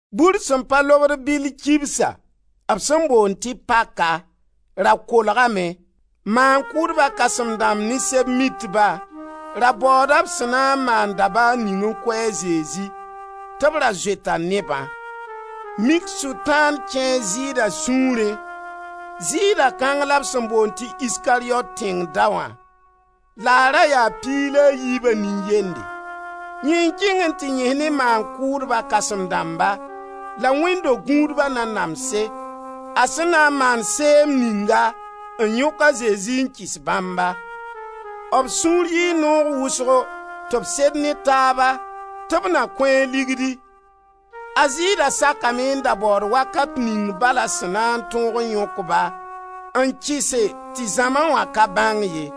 Bur sẽn pa lobd bɩll kibsa, b sẽn boond tɩ paka, ra kolgame. Maan-kʋʋdba kãsem-dãmb ne Sɛb-mitba ra baooda b sẽn na n maan dabaar ning n kʋ a Zezi, tɩ b ra zoeta nebã. Mik Sʋtãan kẽe a Zɩɩda sũurẽ. Zɩɩda kãng la b sẽn boond tɩ Iskariyot tẽng daoã, la a ra yaa piig la a yiiba nin-yende. Yẽ n kẽng n tɩ yẽs ne maan-kʋʋdba kãsem-dãmba la wẽnd-do-gũudba nanamse, a sẽn na n maan seem ninga n yõk a Zezi n kɩs bãmba. B sũur yɩɩ noog wʋsgo tɩ b sed ne taaba tɩ b na kõ-a ligdi. A Zɩɩda sakame n da baood wakat ning bal a sẽn na n tõog n yõk-ba n kɩse tɩ zãma wã ka bãng ye.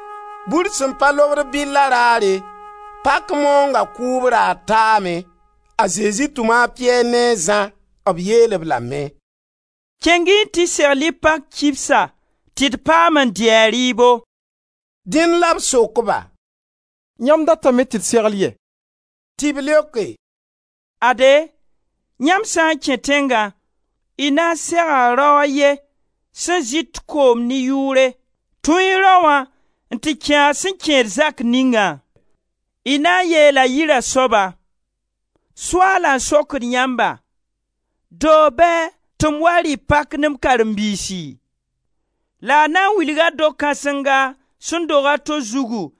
Bur sẽn pa lobd bɩlla raare, pak maoonga kʋʋb raar, taame. A Zezi tʋma a Piyɛr ne a Zã. B yeel-b lame: «Kẽng-y n tɩ segl-y pak kibsa tɩ d pam n dɩ a rɩɩbo.» Dẽn la b sok-ba: «Yãmb datame tɩ d segl yɛ?» Tɩ b leoke: «Ade, yãmb sã n kẽ tẽngã, y na n sega rao a ye sẽn zɩt koom ne yʋʋre, tũu-y raoã n tɩ kẽ a sẽn kẽed zak ningã. Y na n yeela yira soaba: ‹Soaala n sokd yãmba: doog bɛɛ tɩ m wa rɩ pak ne m karen-biisi?› La a na n wilga do-kãsenga sẽn dog a to zugu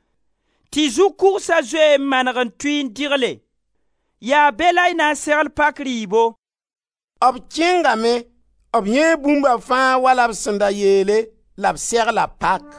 tɩ zu-kʋgsa zoe n maneg n tʋɩ n dɩgle; yaa be la y na n segl pak rɩɩbo.» B kẽngame, b yãee bũmba fãa wala b sẽn da yeele, la b segla pak.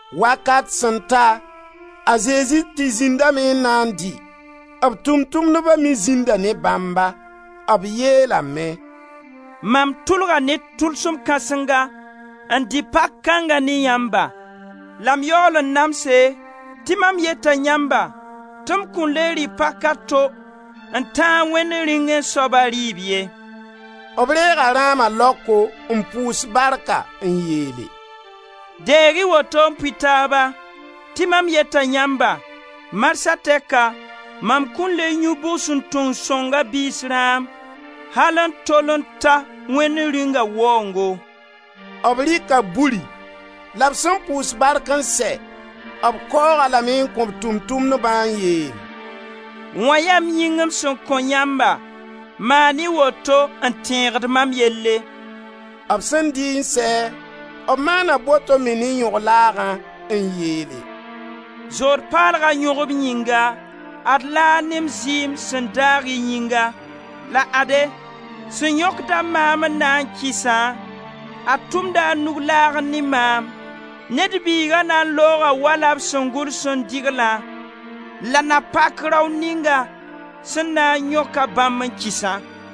Wakat sẽn ta, a Zezi tɩ zĩndame n na n dɩ; b Tʋʋm-tʋmdba me zĩnda ne bãmba. B yeelame: «Mam tʋlga ne tʋlsem kãsenga n dɩ pak kãnga ne yãmba la m yaool n namse, tɩ mam yeta yãmba tɩ m kõn le rɩ pak a to n tãag Wẽnd Rĩungẽ soaba rɩɩb ye.» B reega rãama laoko n pʋʋs barka n yeele: «Deeg-y woto n pʋɩ taaba. Tɩ mam yeta yãmba: marsã tɛka, mam kõn le yũ bugsuntung sõnga biis rãam al n tol n ta Wẽnd Rĩunga waoongo.» B rɩka buri la b sẽn pʋʋs bark n sɛ, b kaoog-a lame n kõ b Tʋʋm-tʋmdbã n yeel: [«Wã yaa m yĩng m sẽn kõ yãmba, maan-y woto n tẽegd mam yelle.» B sẽn dɩ n sɛ, b maana boto me ne yõg-laagã n yeele: «Zood paalga yõgb yĩnga, ad laag ne m zɩɩm sẽn daag y yĩnga.] La ade, sẽn yõkda maam n na n kɩsã, a tʋmda a nug laagẽ ne maam. Ned Biiga na n looga wala b sẽn gʋls n dɩglã. La na pak rao ninga sẽn na n yõka bãmb n kɩsã.»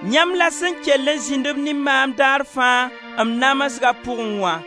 Yãmb la sẽn kell n zĩnd-b ne maam dar fãa m namsga pʋgẽ wã.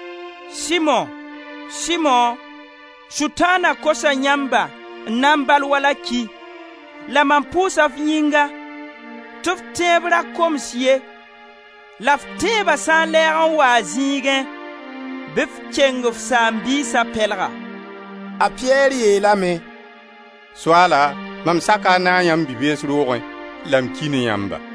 Simo, Simo, Sʋtãana kosa yãmba n na n bal wala ki. La mam pʋʋsa f yĩnga tɩ f tẽeb ra koms ye la f tẽeba sã n n lɛɛg n wa a zĩigẽ, bɩ f keng f saam-biisa pɛlga.» A Piyɛr yeelame: «Soaala mam saka a naag yãmb bi-bees roogẽ la m ki ne yãmba.»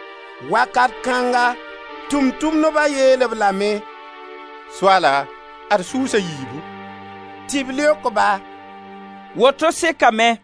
Wakat kãnga Tʋʋm-tʋmdba yeel-b lame: Soaala, ad sʋʋs a yiibu.» Tɩ b leok-ba: «Woto sekame.»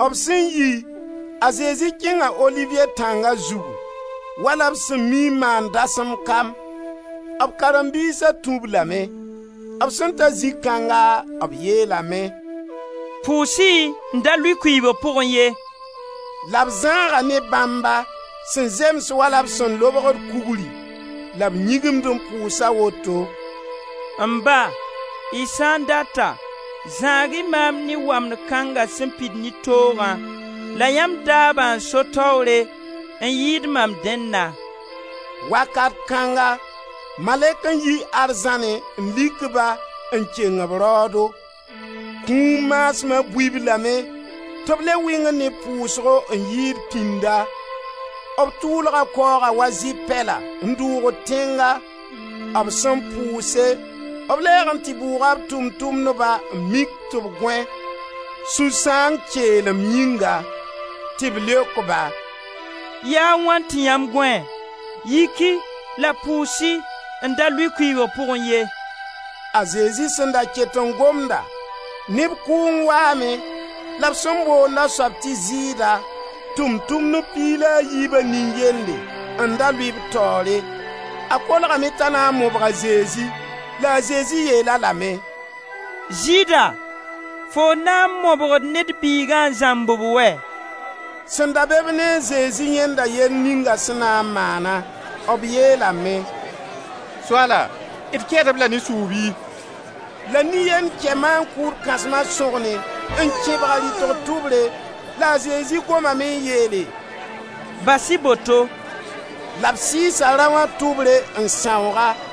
B sẽn yi, a Zezi kẽnga Oliviye tãnga zugu, wala b sẽn mii n maand dasem kam; b karen-biisa tũ-b lame. B sẽn ta zĩ kãnga b yeelame: «Pʋʋs-y n da lʋɩ kʋɩɩbg pʋgẽ ye.» La b zãaga ne bãmba sẽn zems wala b sẽn lobgd kugri, la b yĩgimd n pʋʋsa woto: «M Ba, y sã n data, zãag-y maam ne wamd kãnga sẽn pid ne toogã la yãmb daabã n so taoore n yɩɩd mam dẽnna.» [ Wakat kãnga malɛk n yi arzãnẽ n lik ba n keng b raoodo. Kũum maasma bui-b lame tɩ b le wɩngd ne pʋʋsgo n yɩɩd pĩnda. B tʋʋlga kaooga wa zɩ-pɛla n dʋʋgd tẽnga.] B sẽn pʋʋse, b lɛɛg n tɩ bʋʋga b Tʋʋm-tʋmdba n tɩ mik tɩ b gõe, sũ-sãang keelem yĩnga. Tɩ b leok-ba: «Yaa wãna tɩ yãmb gõe! Yik-y la pʋʋs-y n da lʋɩ kʋɩɩbg pʋgẽ ye.» A Zezi sẽn da ket n gomda, neb kʋʋng waame la b sẽn boonda soab tɩ Zɩɩda, Tʋʋm-tʋmdb piig la a yiiba nin-yende, n da lʋɩ b taoore; a kolgame t'a na n mobg a Zezi. La a Zezi yeel-a lame: «Zɩɩda, foo n na n mobgd Ned Biiga n zãmb-b wɛ?» Sẽn da be-b ne a Zezi yãenda yell ninga sẽn na n maana. B yeelame: «Soaala, d kɛɛd-b la ne sʋʋg bɩ?» La nin-yend kɛ maan-kʋʋd kãsma sõgne n kẽbg a rɩtg tʋbre. La a Zezi gomame m yeele: «Bas-y boto.» La b sɩɩsa raoã tʋbre n sãoog-a.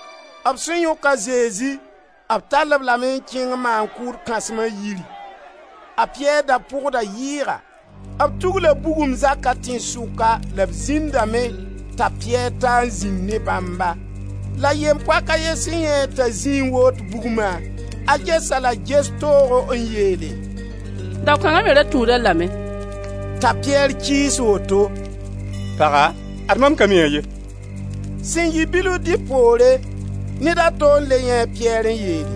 B sẽn yõk a Zezi b tall-b lame n kẽng maan-kʋʋd kãsma yiri. A Piyɛr da pʋgda yɩɩga. B tugla bugum zaka tẽnsʋka la b zĩndame t'a Piyɛr taa n zĩnd ne bãmba. La yem-poak a ye sẽn yãee-a t'a zĩ n woot bugma, a ges-a la ges toogo n yeele: «Dao kãnga me ra tũud-a lame.» T'a Piyɛr kɩɩs woto: «Paga, ad mam ka mi-a ye!» Sẽn yɩ bilf dẽ poore, ned a to n le yãee a Piyɛr n yeele: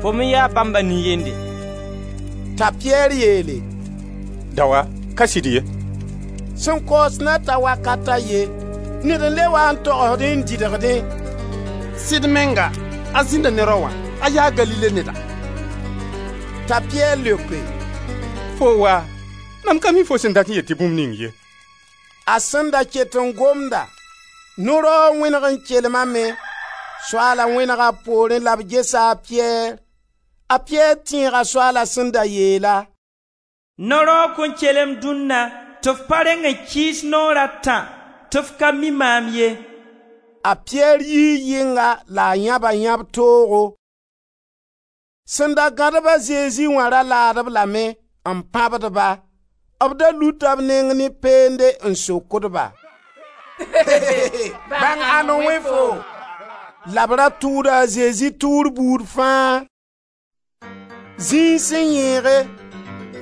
«Fo me yaa bãmba nin-yende.» T'a Piyɛr yeele: «Daoa, ka sɩd ye.» Sẽn kaoos na ta wakat a ye, ned n le wa n togsdẽ n dɩdgdẽ: «Sɩd menga, a zĩnda ne Raoã, a yaa Galile neda.» T'a Piyɛr leoke: «Foo waa! Mam ka m mi fo sẽn dat n yeel tɩ bũmb ning ye.» A sẽn da ket n gomda, no-raoog wẽneg n kelmame. Soaala wẽnega b poorẽ la b gesa a Piyɛr. A Piyɛr tẽega Soaala sẽn da yeel-a: «No-raoog kõn kelem dũnna tɩ f pa reng n kɩɩs naoor a tã tɩ f ka mi maam ye!» A Piyɛr yii yɩnga la a yãba yãb-toogo. Sẽn da gãd-b a Zezi wã ra laad-b lame, n pãbd-ba. B da luta b neng ne peende n sokd-ba: «Bãng ãnd n wẽ foo!» La b ra tʋʋda a Zezi tʋʋr buud fãa. Zĩig sẽn yẽege,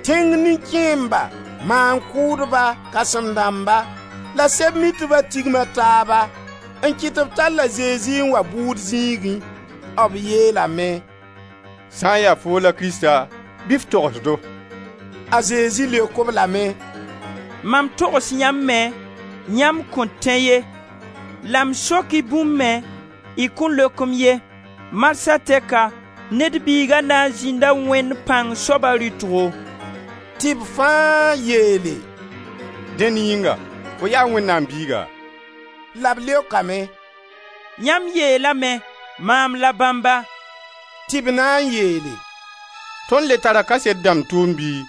tẽng nin-kẽemba, maan-kʋʋdba, kãsem-dãmba la Sɛb-mitba tigma taaba n kɩt tɩ b tall a Zezi n wa bʋʋd zĩigẽ. B yeelame: «Sã n ya foo la Krista, bɩ f togs-do!» A Zezi leok-b lame: «Mam togs yãmb me, yãmb kõn tẽ ye la m sok-y bũmb me y kõn leok-m ye. Marsã tɛka Ned Biiga na n zĩnda Wẽnd-Pãng-Soaba rɩtgo.» Tɩ b fãa yeele: «Dẽn yĩnga, fo yaa Wẽnnaam Biiga?» La b leokame: «Yãmb yeelame, maam la bãmba.» Tɩ b na n yeele: «Tõnd le tara kaset dãmb tʋʋmd bɩ,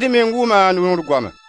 d meng wʋma a noor goama.»